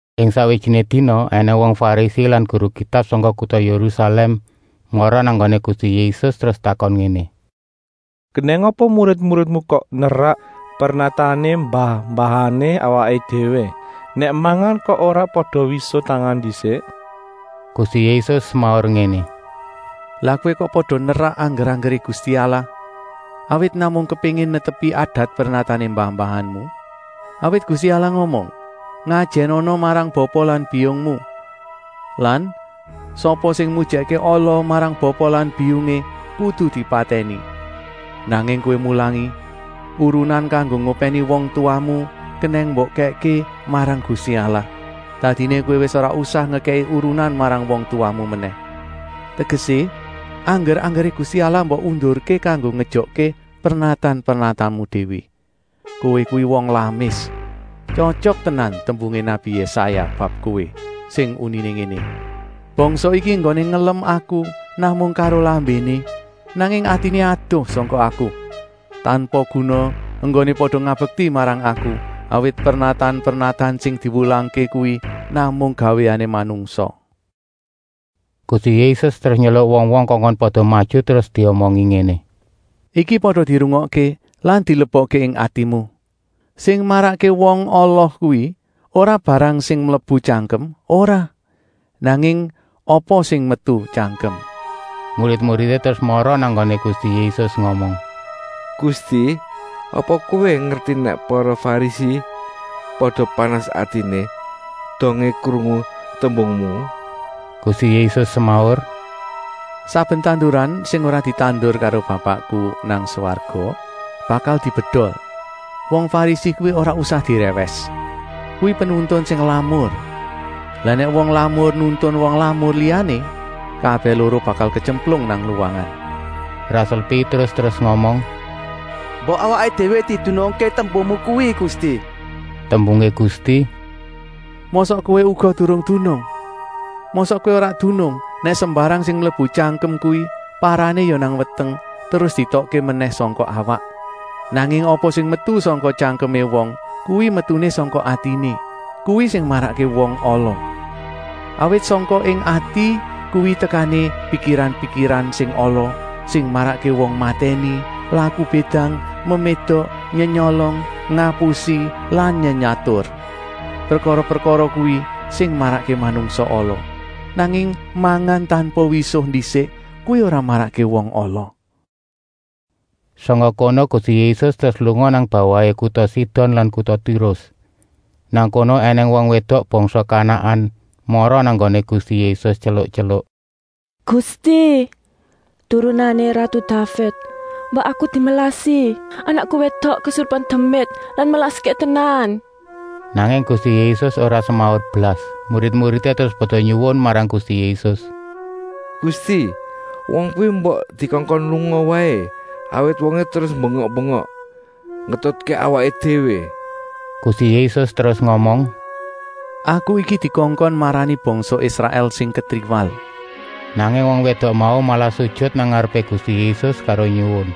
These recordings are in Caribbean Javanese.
Ing sakwijiné dina ènèng wong Farisi lan guru Kitab sangka kuta Yérusalèm mara nang nggoné Gusti Yésus terus takon ngéné: “Kenèng apa murid-muridmu kok nerak pernatané mbah-mbahané awaké déwé? Nèk mangan kok ora pada wisuh tangan ndisik?” Gusti Yésus semaur ngéné: “Lah kowé kok pada nerak angger-anggeré Gusti Allah, awit namung kepéngin netepi adat-pernatané mbah-mbahanmu? Awit Gusti Allah ngomong: ‘Ngajènana marang bapa lan biyungmu,’ lan ‘Sapa sing mujèkké ala marang bapa lan biyungé kudu dipatèni.’ Nanging kowé mulangi: ‘Urunan kanggo ngopèni wong tuwamu kenèng mbok kèkké marang Gusti Allah. Dadiné kowé wis ora usah ngekèki urunan marang wong tuwamu menèh.’ Tegesé, angger-anggeré Gusti Allah mbok undurké kanggo ngejokké pernatan-pernatanmu déwé. Kowé kuwi wong lamis. Tyotyok tenan tembungé nabi Yésaya bab kowé sing uniné ngéné: ‘Bangsa iki enggoné ngelem Aku namung karo lambéné, nanging atiné adoh sangka Aku. Tanpa guna enggoné pada ngabekti marang Aku, awit pernatan-pernatan sing diwulangké kuwi namung gawéané manungsa.’” Gusti Yésus terus nyeluk wong-wong kongkon pada maju, terus diomongi ngéné: “Iki pada dirungokké lan dilebokké ing atimu! Sing marakké wong ala kuwi ora barang sing mlebu tyangkem, ora, nanging apa sing metu tyangkem.” Murid-muridé terus mara nang nggoné Gusti Yésus ngomong: “Gusti, apa Kowé ngerti nèk para Farisi pada panas atiné dongé krungu tembungmu?” Gusti Yésus semaur: “Saben tanduran sing ora ditandur karo Bapakku nang swarga bakal dibedol. Wong Farisi kuwi ora usah dirèwès. Kuwi penuntun sing lamur. Lah nèk wong lamur nuntun wong lamur liyané, kabèh loro bakal ketyemplung nang luwangan.” Rasul Pétrus terus ngomong: “Mbok awaké déwé didunungké tembungmu kuwi Gusti!” Tembungé Gusti: “Mosok kowé uga durung dunung? Mosok kowé ora dunung nèk sembarang sing mlebu tyangkem kuwi parané ya nang weteng terus dietokké menèh sangka awak? Nanging apa sing metu sangka tyangkemé wong kuwi metuné sangka atiné, kuwi sing marakké wong ala. Awit sangka ing ati kuwi tekané pikiran-pikiran sing ala, sing marakké wong matèni, laku bédang, memédok, nyenyolong, ngapusi lan nyenyatur. Prekara-prekara kuwi sing marakké manungsa ala. Nanging mangan tanpa wisuh ndisik, kuwi ora marakké wong ala.” Sangka kono Gusti Yésus terus lunga nang bawahé kuta Sidon lan kuta Tirus. Nang kono ènèng wong wédok bangsa Kanaan mara nang nggoné Gusti Yésus tyeluk-tyeluk: “Gusti, Turunané ratu Daved, mbok aku dimelasi! Anakku wédok kesurupan demit lan melaské tenan!” Nanging Gusti Yésus ora semaur blas. Murid-muridé terus pada nyuwun marang Gusti Yésus: “Gusti, wong kuwi mbok dikongkon lunga waé, awit wongé terus bengak-bengok ngetutké awaké déwé.” Gusti Yésus terus ngomong: “Aku iki dikongkon marani bangsa Israèl sing ketriwal.” Nanging wong wédok mau malah sujut nang ngarepé Gusti Yésus karo nyuwun: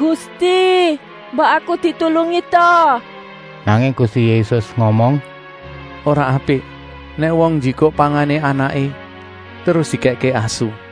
“Gusti, mbok aku ditulungi ta!” Nanging Gusti Yésus ngomong: “Ora apik nèk wong njikuk pangané anaké terus dikèkké asu.”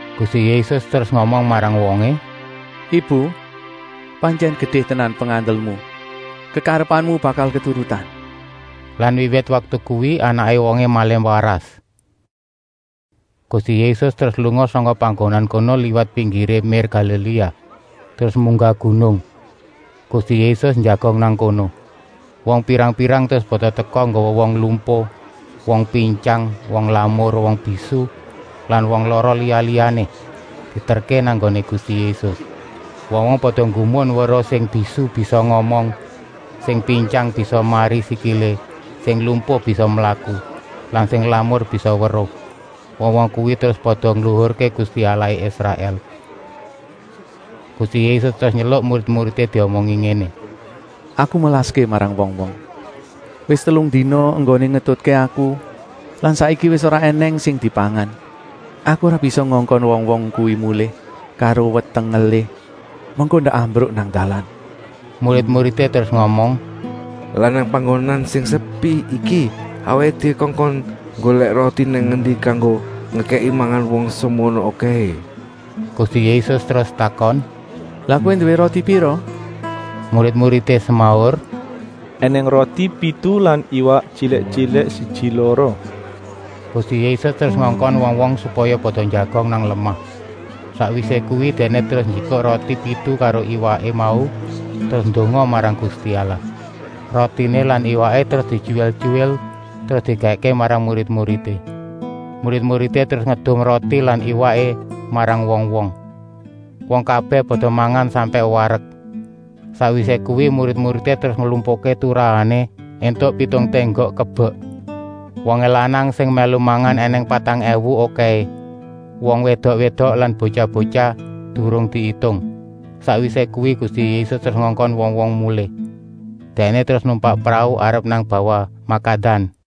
Gusti Yésus terus ngomong marang wongé: “Ibu, pantyèn gedé tenan pengandelmu. Kekarepanmu bakal keturutan.” Lan wiwit waktu kuwi anaké wongé malih waras. Gusti Yésus terus lunga sangka panggonan kono liwat pinggiré mér Galiléa, terus munggah gunung. Gusti Yésus njagong nang kono. Wong pirang-pirang terus pada teka nggawa wong lumpuh, wong pintyang, wong lamur, wong bisu lan wong lara liya-liyané, dieterké nang nggoné Gusti Yésus. Wong-wong pada nggumun weruh sing bisu bisa ngomong, sing pintyang bisa mari sikilé, sing lumpuh bisa mlaku lan sing lamur bisa weruh. Wong-wong kuwi terus pada ngluhurké Gusti Allahé Israèl. Gusti Yésus terus nyeluk murid-muridé diomongi ngéné: “Aku melaské marang wong-wong. Wis telung dina enggoné ngetutké Aku lan saiki wis ora ènèng sing dipangan. Aku ora bisa ngongkon wong-wong kuwi mulih karo weteng ngelih, mengko ndak ambruk nang dalan.” Murid-muridé terus ngomong: “Lah nang panggonan sing sepi iki awaké déwé kongkon nggolèk roti nang endi kanggo ngekèki mangan wong semono okèhé?” Gusti Yésus terus takon: “Lah kowé nduwé roti pira?” Murid-muridé semaur: “Enèng roti pitu lan iwak tyilik-tyilik siji-loro.” Gusti Yésus terus ngongkon wong-wong supaya pada njagong nang lemah. Sakwisé kuwi Dèkné terus njikuk roti pitu karo iwaké mau terus ndonga marang Gusti Allah. Rotiné lan iwaké terus dityuwil-tyuwil terus dikèkké marang murid-muridé. Murid-muridé terus ngedum roti lan iwaké marang wong-wong. Wong kabèh pada mangan sampèk warek. Sakwisé kuwi murid-muridé terus nglumpukké turahané, éntuk pitung ténggok kebek. Wongé lanang sing mèlu mangan ènèng patang èwu okèhé, wong wédok-wédok lan botyah-botyah durung diitung. Sakwisé kuwi Gusti Yésus terus ngongkon wong-wong mulih. Dèkné terus numpak prau arep nang bawah Makadan.